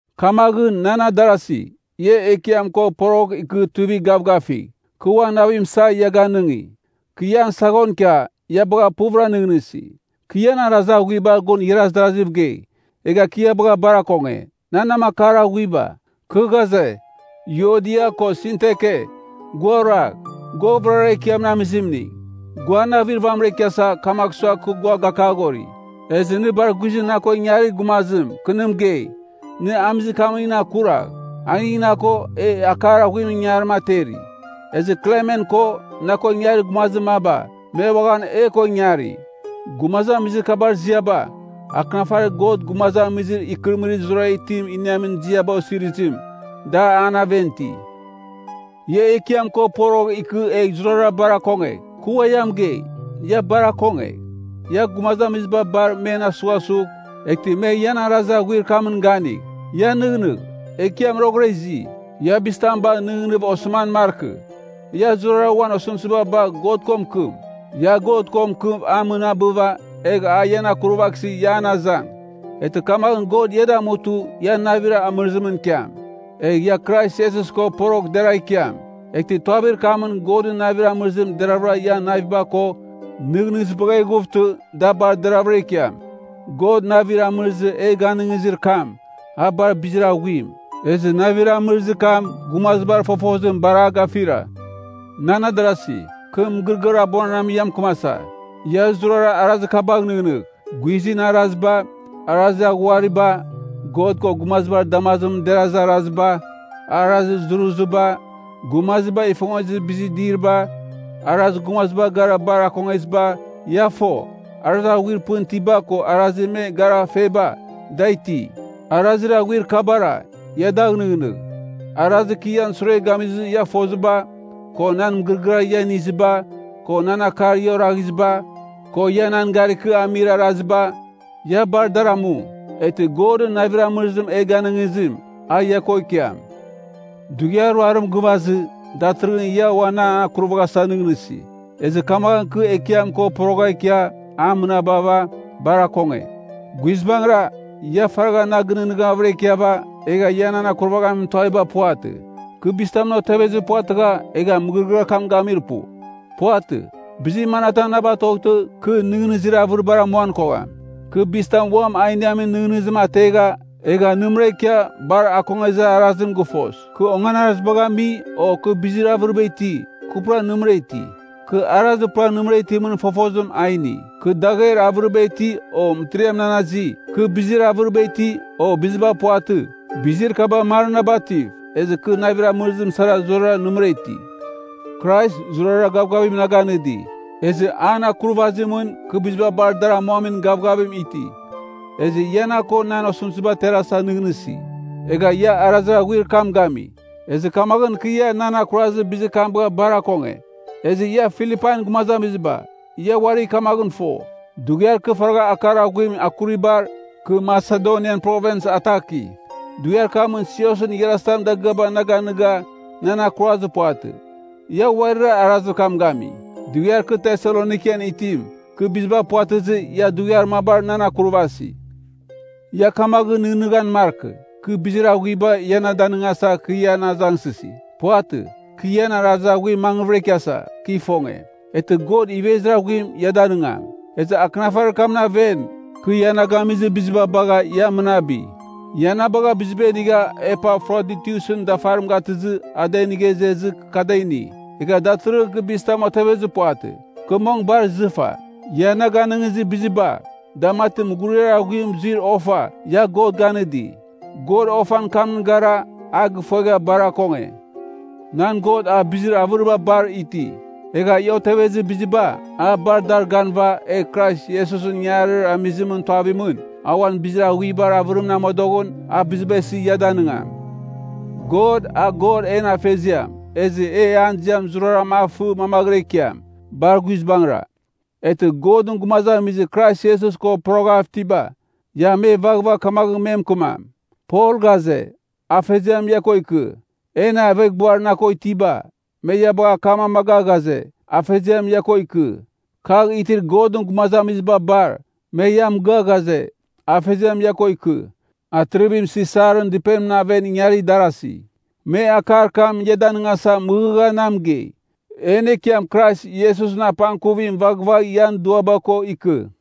Kamaghɨn, nan adarasi, ia Ekiam ko poroghɨv ikɨ tuivigh gavgafigh. Kɨ uan navim isa ia ganɨngi! Kɨ ian saghon ikia, ia bagha puvɨra nɨghnɨsi! Kɨ ian arazir aghuibar gun igharaz darasiv gei! Egha kɨ ia bagha bar akonge, nan namakar aghuiba! Kɨ ghaze, Yuodia ko Sintike, gua oragh. Gua vɨrara Ekiamɨn amizimning, gua navir vamɨra ikiasa, kamagh sua kɨ gua gakaghori. Ezɨ nɨ bar guizɨn na ko ingarir gumazim, kɨ nɨ mɨgei, nɨ amizir kamningɨn akuragh. Aning na ko, e akar aghuimɨn ingangarim ateri. Ezɨ Klemen ko, na ko ingarir gumazir maba, me uaghan e ko ingari. Gumazamizir kabar ziaba, akɨnafarir God gumazamizir ikɨrɨmɨrir zurara itim iniamin ziaba osirizim, da an aven iti. Ia Ekiam ko porogh ikɨ egh zurara bar akongegh. Kɨ ua mɨgei, ia bar akongegh. Ia gumazamiziba bar men asughasugh, eghtɨ me ian arazir aghuir kamɨn ganigh. Ia nɨghnɨgh, Ekiam roghɨra izi. Ia bizitam bagh nɨghnɨghɨv osɨman markɨ. Ia zurara uan osɨmtɨziba bagh God ko mɨkɨm. Ia God ko mɨkɨm a mɨnabɨva, egh a ian akurvaghsɨ ia an azang. Eghtɨ kamaghɨn God ia damutɨ ia navir amɨrɨzimɨn ikiam. Egh ia Krais Iesus ko poroghɨv deragh ikiam, eghtɨ tuavir kamɨn Godɨn navir amɨrɨzim deravɨra ian naviba ko nɨghnɨzibagh eghuvtɨ da bar deravɨra ikiam. God navir amɨrɨzir e ganɨngizir kam, a bar bizir aghuim, ezɨ navir amɨrɨzir kam gumazibar fofozim bar a gafira. Nan adarasi, kɨ mɨgɨrɨgɨar abuananam ia mɨkɨmasa. Ia zurara arazir kabagh nɨghnɨgh: guizɨn araziba, arazir aghuariba, God ko gumazibar damazimɨn derazir araziba, arazir zuruziba, gumaziba ifongezir bizir diriba, arazir gumaziba gara bar akongeziba. Ia fo, arazir aghuir pɨn itiba ko arazir me gara feba, da iti. Arazir aghuir kabara, ia dagh nɨghnɨgh. Arazir kɨ ian sure gamizɨ ia foziba, ko nan mɨgɨrɨgɨar ia iniziba, ko nan akar ia oraghiziba, ko ia nan gari kɨ amir araziba, ia bar dar amu. Eghtɨ Godɨn navir amɨrizim e ganɨngizim, a ia ko ikiam. Dughiar ruarim gɨvazɨ, datɨrɨghɨn ia ua nan akurvaghasa nɨghnɨsi, ezɨ kamaghɨn kɨ Ekiam ko poroghav ikia a mɨnabava, bar akonge. Guizbangɨra, ia faragha na ginɨghnɨghavɨra ikiava, egha ia nan akurvaghamin tuaviba puvatɨ. Kɨ bizitamɨn otevezir puvatɨgha egha mɨgɨrɨgɨar kam gamir pu. Puvatɨ. Bizir manatam na batoghtɨ, kɨ nɨghnɨzir avɨribar amuan kogham. Kɨ bizitam uam a iniamin nɨghnɨzim ategha, egha nɨmɨra ikia bar akongezir arazim gɨfos. Kɨ onganarazibagh ami, o kɨ bizir avɨriba iti, kɨ pura nɨmɨra iti. Kɨ arazir pura nɨmɨra itimɨn fofozim a ini. Kɨ dagher avɨriba iti, o mɨtiriam nan azi, kɨ bizir avɨriba iti, o biziba puvatɨ, bizir kaba mar na bativ, ezɨ kɨ navir amɨrɨzim sara zurara nɨmɨra iti. Krais zurara gavgavim na ganɨdi, ezɨ an akurvazimɨn kɨ biziba bar dar amuamin gavgavim iti. Ezɨ ia na ko nan osɨmtɨzim aterasa nɨghnɨsi, egha ia arazir aghuir kam gami. Ezɨ kamaghɨn kɨ ia nan akurazir arazim bagha bar akonge. Ezɨ ia Filipain gumazamiziba, ia uari kamaghɨn fo, dughiar kɨ faragha akar aghuim akuribar, kɨ Masedonian Provins ataki, dughiar kamɨn siosɨn igharazitam dagɨaba na ganɨga, nan akurazir puvatɨ. Ia uarira arazir kam gami. Dughiar kɨ Teselonikan itim, kɨ biziba puvatɨzɨ, ia dughiar mabar nan akurvasi. Ia kamaghɨn nɨghnɨghan markɨ, kɨ bizir aghuiba ia na danɨngasa kɨ ian azangsɨsi. Puvatɨ. Kɨ ian arazir aghuim mangvɨra ikiasa, kɨ ifonge. Eghtɨ God ivezir aghuim ia danɨngam. Ezɨ akɨnafarir kamɨn aven, kɨ ia na gamizir biziba bagha ia mɨnabi. Ia na bagha biziba inigha Epafroditusɨn dafarim gatɨzɨ a da inigha izezɨ kɨ da ini. Egha datɨrɨghɨn kɨ bizitam otevezir puvatɨ, kɨ mong bar izɨfa. Ia na ganɨngizir biziba, da mati mughuriar aghuim zuir ofa ia God ganɨdi. God ofan kamɨn gara a gifuegha bar akonge. Nan God a bizir avɨriba bar iti. Egh ia otevezir biziba, a bar dar ganɨva, egh Krais Iesusɨn ingangarir amizimɨn tuavimɨn, a uan bizir aghuibar avɨrimɨn amodoghɨn, a biziba isɨ ia danɨngam. God, a God en Afeziam, ezɨ e an ziam zurara a fɨ mamaghɨra ikiam. Bar guizbangɨra! Eghtɨ, Godɨn gumazamizir Krais Iesus ko poroghav itiba, ia me vaghvagh kamaghɨn me mɨkɨmam, Pol ghaze, Afeziam ia ko ikɨ. En aveghbuar na ko itiba, me ia bagha akam amaga ghaze, Afeziam ia ko ikɨ. Kagh itir Godɨn gumazamiziba bar, me ia mɨgɨa ghaze, Afeziam ia ko ikɨ. Atirivim Sisarɨn dɨpenimɨn aven ingarir darazi, me akar kam ia danɨngasa mɨghɨgha na mɨgei. En Ekiam Krais Iesusɨn apangkuvim vaghvagh ian duaba ko ikɨ.